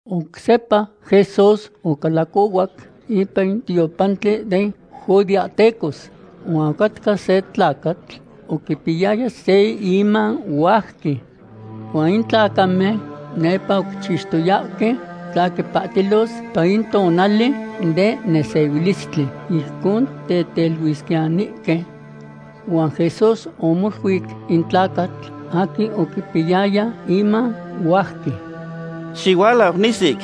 Oc sepa Jesús ocalacohuac ipan in tiopantli den judeahtecos. Huan ocatca se tlacatl oquipiyaya se iman huajqui. Huan in tlacamen nepa oquichixtoyahque tla quipahtilos ipan in tonali den nesehuilistli, ijcon teteluisquiyanihque. Huan Jesús omoluic in tlacatl aquin oquipiyaya iman huajqui: ―¡Xihualau nisic!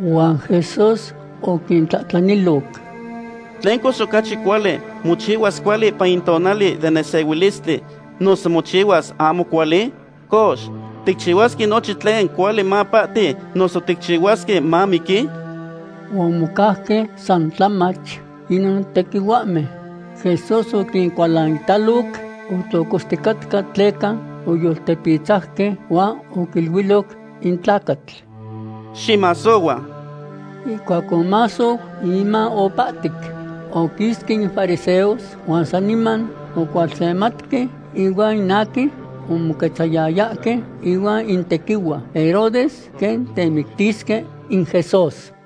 Huan Jesús oquintlahtlaniloc: ―¿Tlen cox ocachi cuali; mochihuas cuali ipan in tonali den nesehuilistli, noso mochihuas ahmo cuali? Cox, ¿ticchihuasque nochin tlen cuali mapahti, noso ticahuasque mamiqui? Huan omocauque san tlamach inon tequihuahmen. Jesús oquincualanitaloc, otlocoxticatca tleca oyoltepitzauque, huan oquiluiloc in tlacatl: ―Ximasohua. Ihcuac omasou, in iman opahtic. Oquisque in fariseos huan saniman ocualsematque ihuan in aquin omoquetzayayahque ihuan in tequihua Herodes quen temictisque in Jesús.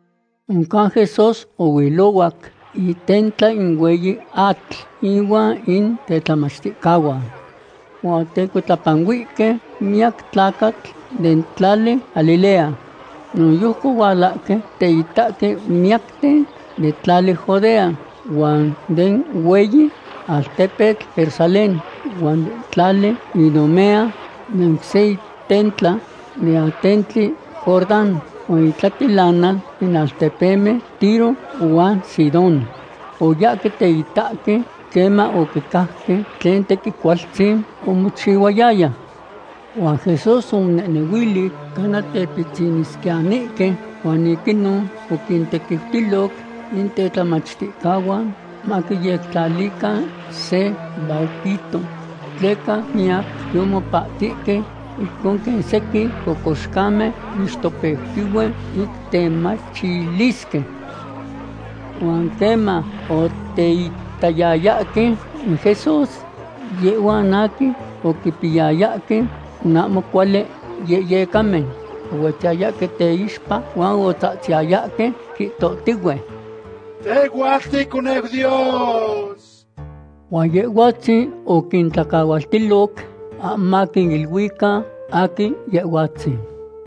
Oncan Jesús ohuilohuac itentla in hueyi atl inuan in tetlamachticahuan. Huan otecuitlapanuihque miyac tlacatl den tlali Galilea. Noyojqui ohualahque teitahque miyacten den tlali Judea, huan den hueyi altepetl Jerusalén, huan den tlali Idumea den oc se itentla den atentli Jordán, huan itlatilanal den altepemen Tiro huan Sidón. Oyahque teitahque queman oquicajque tlen tequin cualtzin omochihuayaya. Huan Jesús omonehnehuili cana tepitzinisquiyanihque huan ic inon oquintequiutiloc in tetlamachticahuan maquiyectlalican se barquito. Tleca miyac yomopahtihque ijcon quen sequin cocoxcamen moixtopeutihue ic temachilisque. Huan queman oteitayayahque in Jesús, yehhuan aquin oquipiyayahque in ahmo cuali yehyecamen ohuetziyayahque teixpa huan otzahtziyayahque, quihtohtihue: ―Tehhuatl ticoneu Dios. Huan Yehhuatzin oquintlacahualtiloc ahmo maquiniluican aquin Yehhuatzin.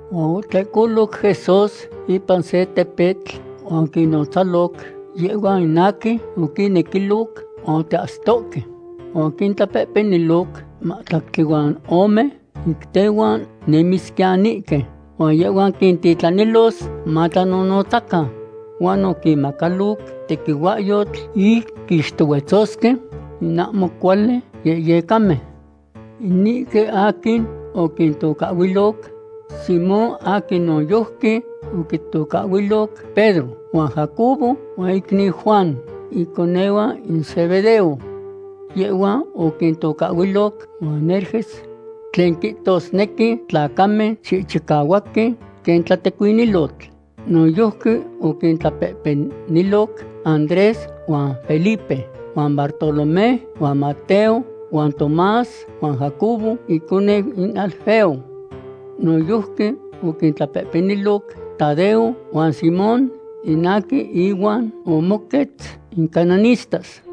Huan otlehcoloc Jesús ipan se tepetl huan oquinnotzaloc yehhuan aquin oquinnequiloc huan oteahsitohque. Huan oquintlapehpeniloc in mahtlactli huan ome ic tehuan nemisquiyanihque, huan yehhuan quintitlanilos matlanonotzacan. Huan oquinmacaloc tequihuahyotl ic quixtohuetzosque in ahmo cuali yehyecamen. Inihque aquin oquintocahhuiloc Simón aquin noyojqui oquitocahhuiloc Pedro, huan Jacobo huan icniu Juan, iconehuan in Zebedeo. Yehhuan oquintocahhuiloc Boanerges, tlen quihtosnequi tlacamen chihchicahuahque quen tlatecuinilotl. Noyojqui oquintlapehpeniloc Andrés huan Felipe huan Bartolomé huan Mateo huan Tomás huan Jacobo iconeu in Alfeo. Noyojqui oquintlapehpeniloc Tadeo huan Simón in aquin ihuan omoquetz in cananistas,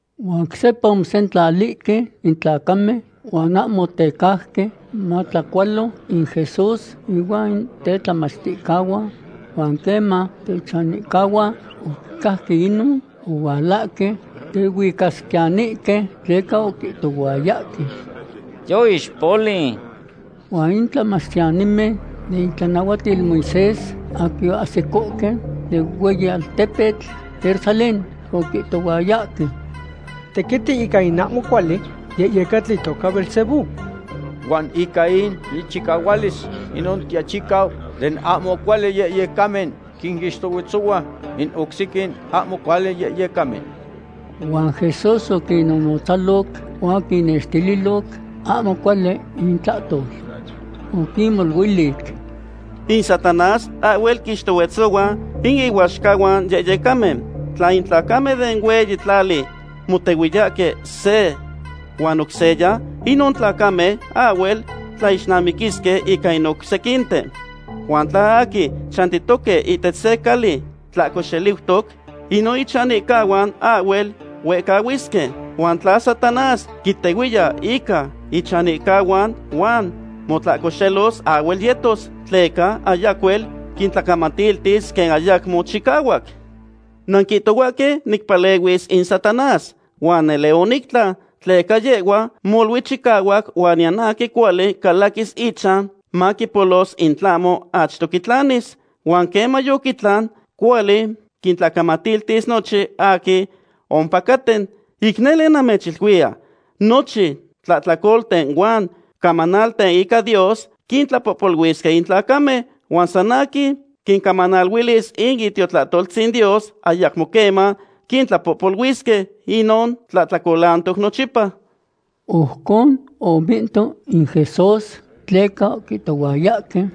Huan oc sepa omosentlalihque in tlacamen, huan ahmo otecauque matlacualo in Jesús ihuan in tetlamachticahuan. Huan queman techanihcahuan oquicajque inon, ohualahque tehuicasquiyanihque, tleca oquihtohuayahque: ―Yoixpoliu. Huan in tlamachtiyanimen den itlanahuatil Moisés aquin oahsicohque den hueyi altepetl Jerusalén oquihtohuayahque: ―Tequiti ica in ahmo cuali yehyecatl itoca Beelzebú, huan ica in ichicahualis inon tiachicau den ahmo cuali yehyecamen quinixtohuetzohua in oc sequin ahmo cuali yehyecamen. Huan Jesús oquinnotzaloc huan oquinnextililoc ahmo cuali intlahtol. Oquinmoluilic: ―In Satanás ahhuel quinixtohuetzohua in ihuaxcahuan yehyecamen. Tla in tlacamen den hueyi tlali motehuiyahque se huan oc seya, inon tlacamen ahhuel tlaixnamiquisque ica in oc sequinten. Huan tla aquin chantitoque ihtech se cali tlahco xeliutoc, inon ichanihcahuan ahhuel huehcahuisque. Huan tla Satanás quitehuiya ica ichanihcahuan huan motlahcoxelos, ahhuel yetos, tleca ayacuel quintlacamatiltis quen ayacmo chicahuac. ’Nanquihtohuahque nicpalehuis in Satanás, huan nele onictlan, tleca yehhua molui chicahuac huan niyan aquin cuali calaquis ichan maquipolos in tlahmo achto quitlanis. Huan queman yoquitlan, cuali quintlacamatiltis nochin aquin ompacaten. ’Ic nele namechiluiya, nochin tlahtlacolten huan camanalten ica Dios quintlapohpoluisque in tlacamen. Huan san aquin quicamanaliluis in Itiotonaltzin Dios ayacmo queman quitlapohpoluisque. Inon tlahtlacolantoc nochipa. Ojcon omihto in Jesús tleca oquihtohuayahque: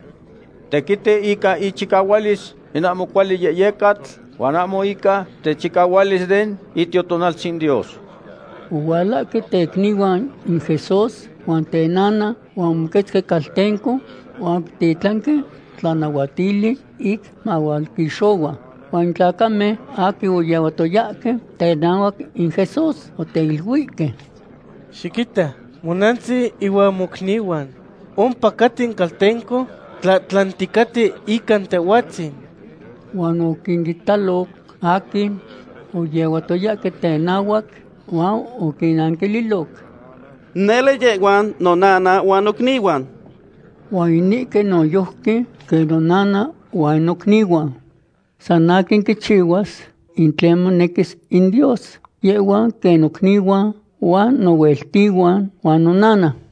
―Tequiti ica ichicahualis in ahmo cuali yehyecatl, huan ahmo ica techicahualis den Itiotonaltzin Dios. Ohualahque tecnihuan in Jesús huan tenana, huan omoquetzque caltenco huan oquititlanque tlanahuatili ic mahualquixohua. Huan in tlacamen aquin oyehuatoyahque tenahuac in Jesús oteiluihque: ―Xiquita, monantzin ihuan mocnihuan ompacaten caltenco tlahtlanticaten ica Tehhuatzin. Huan oquinitaloc aquin oyehuatoyahque tenahuac huan oquinnanquililoc: ―Nele yehhuan nonana huan nocnihuan. Huan inihque noyojqui quen nonana huan nocnihuan. San aquin quichihuas in tlen monequis in Dios, yehhuan quen nocnihuan, huan nohueltihuan, huan nonana.